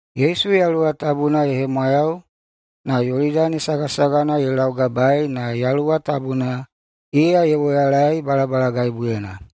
Yesu Yaluwa Tabuna ye hemwayau, na Yolidani sagasagana ye laugabaei na Yaluwa Tabuna iya ye woyalaei balabalagaibuyena.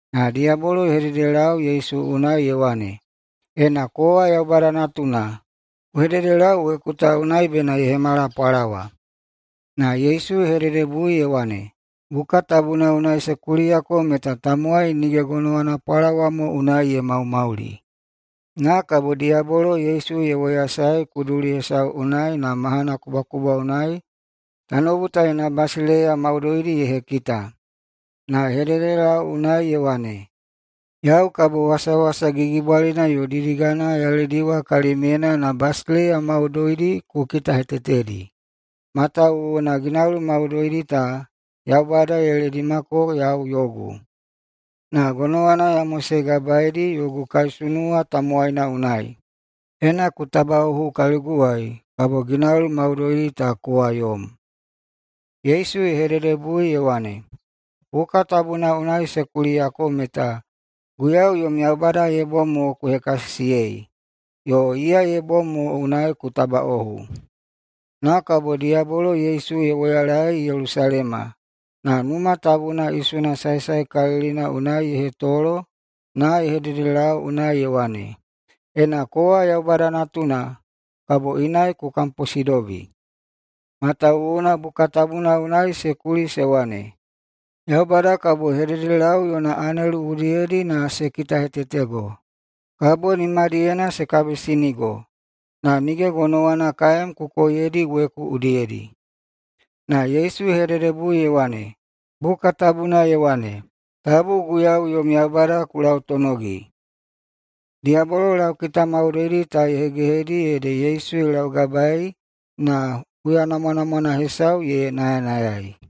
Na diyabolo ye hededelau Yesu unai ye wane, “Ena kowa Yaubada Natuna, ku hededelau weku ta unai bena ye hemala pwalawa.” Na Yesu ye hededebui ye wane, “Buka tabuna unai se kuliyako meta tamowai nige gonowana pwalawa mo unai ye maumauli.” Na kabo diyabolo Yesu ye woyasaei kuduli hesau unai na mahana kubwakubwa unai tanoubu ta yona basileiya maudoidi ye hekita. Na ye hededelau unai ye wane, “Yau kabo wasawasa gigibwalina yo didigana ya lediwa kalimyena na basileiya maudoidi ta ku kitahetetedi. Matawuwuna ginauli maudoidi ta Yaubada ye ledimako yau yogu, na gonowana ya mosegabaedi yogu kaisunuwa tamowaina unai. Ena ku tabaꞌohu kaliguwai, kabo ginauli maudoidi ta kowa yom.” Yesu ye hededebui ye wane, “Buka tabuna unai se kuliyako meta, ‘Guiyau yom Yaubada ye bom mo ku hekasisiyei, yo iya ye bom mo unai ku tabaꞌohu.’” Na kabo diyabolo Yesu ye woyalaei Yelusalema. Na Numa Tabuna isuna saesaekalilina unai ye hetolo na ye hededelau unai ye wane, “Ena kowa Yaubada Natuna, kabo inai ku kamposidobi. Matawuwuna Buka Tabuna unai se kuli se wane, ‘Yaubada kabo ye hededelau yona anelu udiyedi na se kitahetetego. Kabo nimadiyena se kabisinigo, na nige gonowana kaem ku koiyedi weku udiyedi.’” Na Yesu ye hededebui ye wane, “Buka Tabuna ye wane, ‘Tabu Guiyau yom Yaubada ku lautonogi.’” Diyabolo laukita maudoidi ta ye hegehedi ede Yesu ye laugabaei na huya namwanamwana hesau ye nayanayai.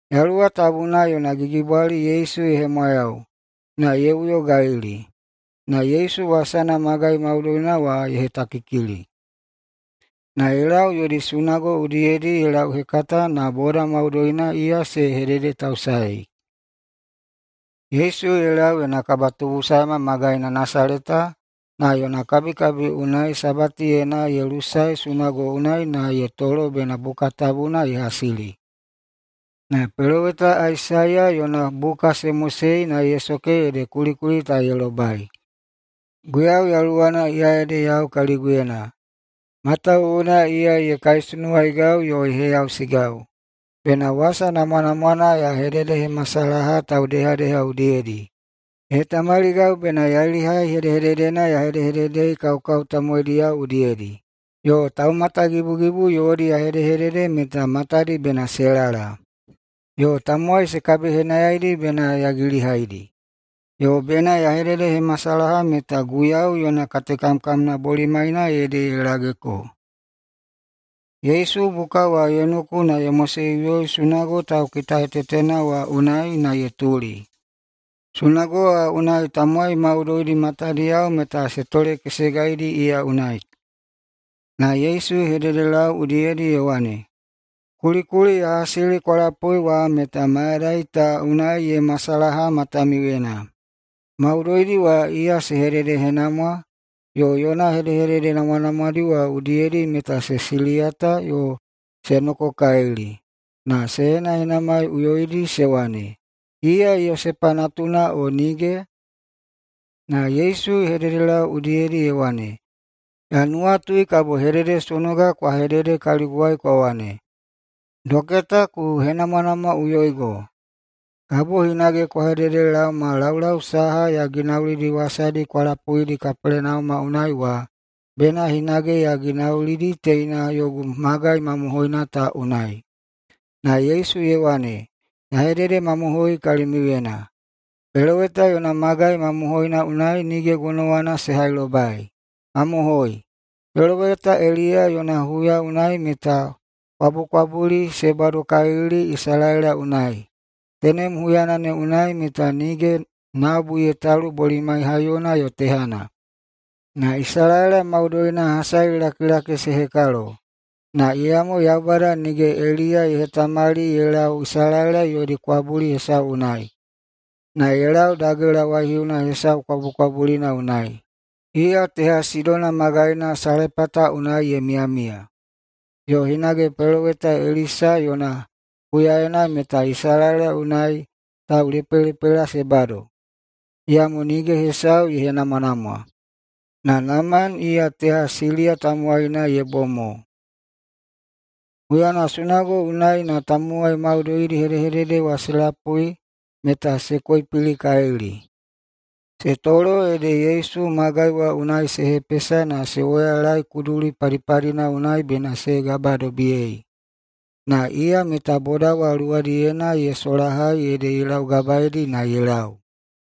Yaluwa Tabuna yona gigibwali Yesu ye hemwayau na ye uyo Galili. Na Yesu wasana magai maudoina wa ye hetakikili. Na ye lau yodi sunago udiyedi ye lauhekata na boda maudoina iya se hededetausaei. Yesu ye lau yona kabatubusae magaina Nasaleta na yona kabikabi unai Sabatiyena ye lusae sunago unai na ye tolo bena Buka Tabuna ye hasili. Na peloweta Aisaiya yona buka se mosei na ye soke ede kulikuli ta ye lobai: “Guiyau yaluwana, iya ede yau kaliguyena, matawuwuna iya [ye kaisunuwaigau yo] ye heyausigau bena wasa namwanamwana ya hededehemasalaha taudehadeha udiyedi. Ye hetamaligau bena yailihai hedehededena ya hedehededei kaukau tamowaidiyao udiyedi, yo taumatagibugibu yodi ya hedehedede meta matadi bena se lala, yo tamowai se kabihenayaidi bena ya gilihaidi, yo bena ya hededehemasalaha meta Guiyau yona katekamkamna bolimaina ede ye lageko.” Yesu buka wa ye noku na ye moseꞌuyoi sunago taukitahetetena wa unai na ye tuli. Sunago wa unai tamowai maudoidi matadiyao meta se tolekesegaidi iya unai. Na Yesu ye hededelau udiyedi ye wane, “Kulikuli ya hasili kwa lapui wa meta mayadai ta unai ye masalaha matamiuyena.” Maudoidi wa iya se hededehenamwa yo yona hedehedede namwanamwadi wa udiyedi meta se siliyata yo se nokokalili na se henahenamaiꞌuyoidi se wane, “Iya Yosepa natuna o nige?” Na Yesu ye hededelau udiyedi ye wane, “Ya nuwatui kabo hededesonoga kwa hedede kaliguwai kwa wane, ‘Doketa, ku henamwanamwaꞌuyoigo!’ Kabo hinage kwa hededelaoma laulau saha ya ginaulidi wasadi kwa lapuidi Kapelenauma unai wa, bena hinage ya ginaulidi teina yogu magai mamohoina ta unai.” Na Yesu ye wane, “Ya hededemamohoi kalimiuyena: Peloweta yona magai mamohoina unai nige gonowana se hailobai. Mamohoi, peloweta Eliya yona huya unai meta kwabukwabuli se badokalili Isalaela unai. Tenem huyana ne unai meta nige nabu ye talu bolimai haiyona yo tehana, na Isalaela maudoina hasalilakilaki se hekalo. Na iyamo Yaubada nige Eliya ye hetamali ye lau Isalaela yodi kwabuli hesau unai, na ye lau dagela waihiuna hesau kwabukwabulina unai, iya teha Sidona magaina Salepata unai ye miyamiya. Yo hinage peloweta Elisa yona huyaena meta Isalaela unai taulepelepela se bado, iyamo nige hesau ye henamwanamwa, na Naman iya teha Siliya tamowaina ye bom mo.” Huyana sunago unai na tamowai maudoidi hedehedede wa se lapui meta se koipilikalili. Se tolo ede Yesu magai wa unai se hepesa na se woyalae kuduli padipadina unai bena se gabadobiyei. Na iya meta boda wa luwadiyena ye solahai ede ye laugabaeidi na ye lau.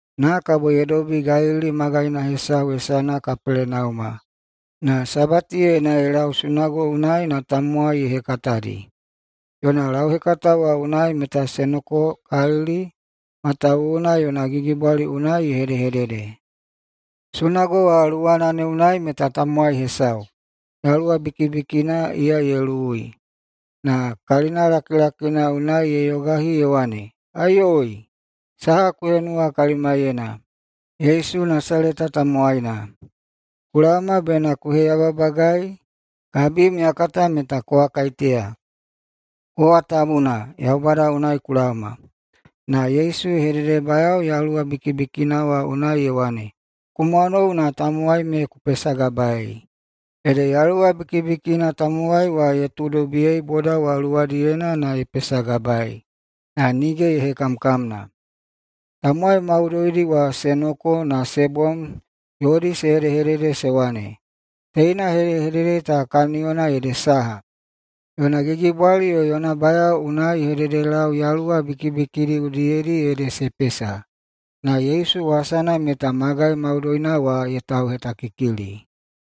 Na kabo ye dobi Galili magaina hesau hesana Kapelenauma. Na Sabatiyena [ye lau sunago unai na] tamowai ye hekatadi. Yona lauhekata wa unai meta se nokokalili, matawuwuna yona gigibwali unai ye hedehedede. Sunago wa luwana ne unai meta tamowai hesau, yaluwa bikibikina iya ye luwui, na kalina lakilakina unai ye yogahi ye wane, “Aiyoi! Saha ku henuwa kalimaiyena, Yesu Nasaleta tamowaina? Ku laoma bena ku heyababagai? Kabim ya kata kowa kaiteya: Kowa Tabuna, Yaubada unai ku laoma.” Na Yesu ye hededebayao yaluwa bikibikina wa unai ye wane, “Ku mwanou na tamowai me ku pesagabaei!” Ede yaluwa bikibikina tamowai wa ye tuudobiyei boda wa luwadiyena na ye pesagabaei, na nige ye hekamkamna. Tamowai maudoidi wa se noko na se bom yodi se hedehedede se wane, “Teina hedehedede ta kaniyona ede saha? Yona gigibwali yo yona bayao unai ye hededelau yaluwa bikibikidi udiyedi, ede se pesa.” Na Yesu wasana meta magai maudoina wa ye tauhetakikili.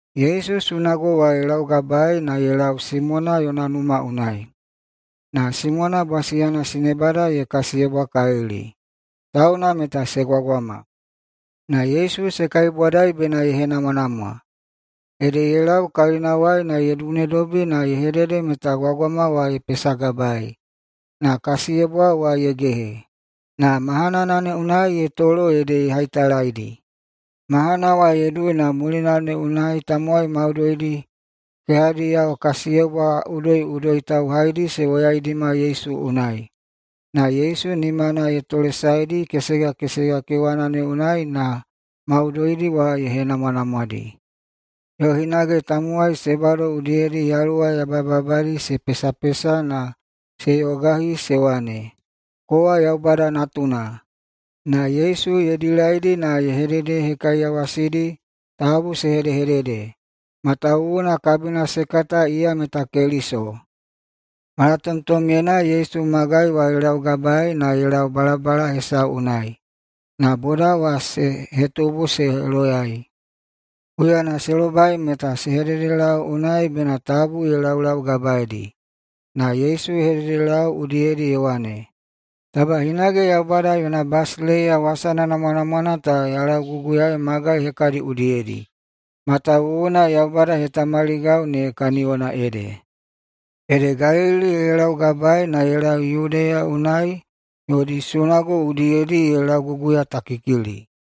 Yesu sunago wa ye laugabaei na ye lau Simona yona numa unai. Na Simona bwasiyana sinebada ye kasiyebwakalili, tauna meta se gwagwama. Na Yesu se kaibwadai bena ye henamwanamwa. Ede ye lau kalinawai na ye dunedobi na ye hedede meta gwagwama wa ye pesagabaei, na kasiyebwa wa ye gehe. Na mahanana ne unai ye tolo ede ye haitalaidi. Mahana wa ye dui na mulina ne unai tamowai maudoidi kehadiyao kasiyebwa udoiꞌudoi tauhaidi se woyaidima Yesu unai. Na Yesu nimana ye tolesaedi kesega kesega kewana ne unai na maudoidi wa ye henamwanamwadi. Yo hinage tamowai se bado udiyedi yaluwa yabayababadi se pesapesa na se yogayogahi se wane, “Kowa Yaubada Natuna.” Na Yesu ye dilaidi na ye hededehekaiyawasidi tabu se hedehedede, matawuwuna kabina se kata iya meta Keliso. Malatomtomyena Yesu magai wa ye laugabaei na ye lau balabala hesau unai. Na boda wa se hetubu se loyai. Huyana se lobai meta se hededelau unai bena tabu ye laulaugabaeidi. Na Yesu ye hededelau udiyedi ye wane, “Taba hinage Yaubada yona basileiya wasana namwanamwana ta ya lauguguyaei magai hekadi udiyedi, matawuwuna Yaubada ye hetamaligau ne kaniyona ede.” Ede Galili ye laugabae na ye lau Yudeya unai yodi sunago udiyedi ye lauguguyatakikili.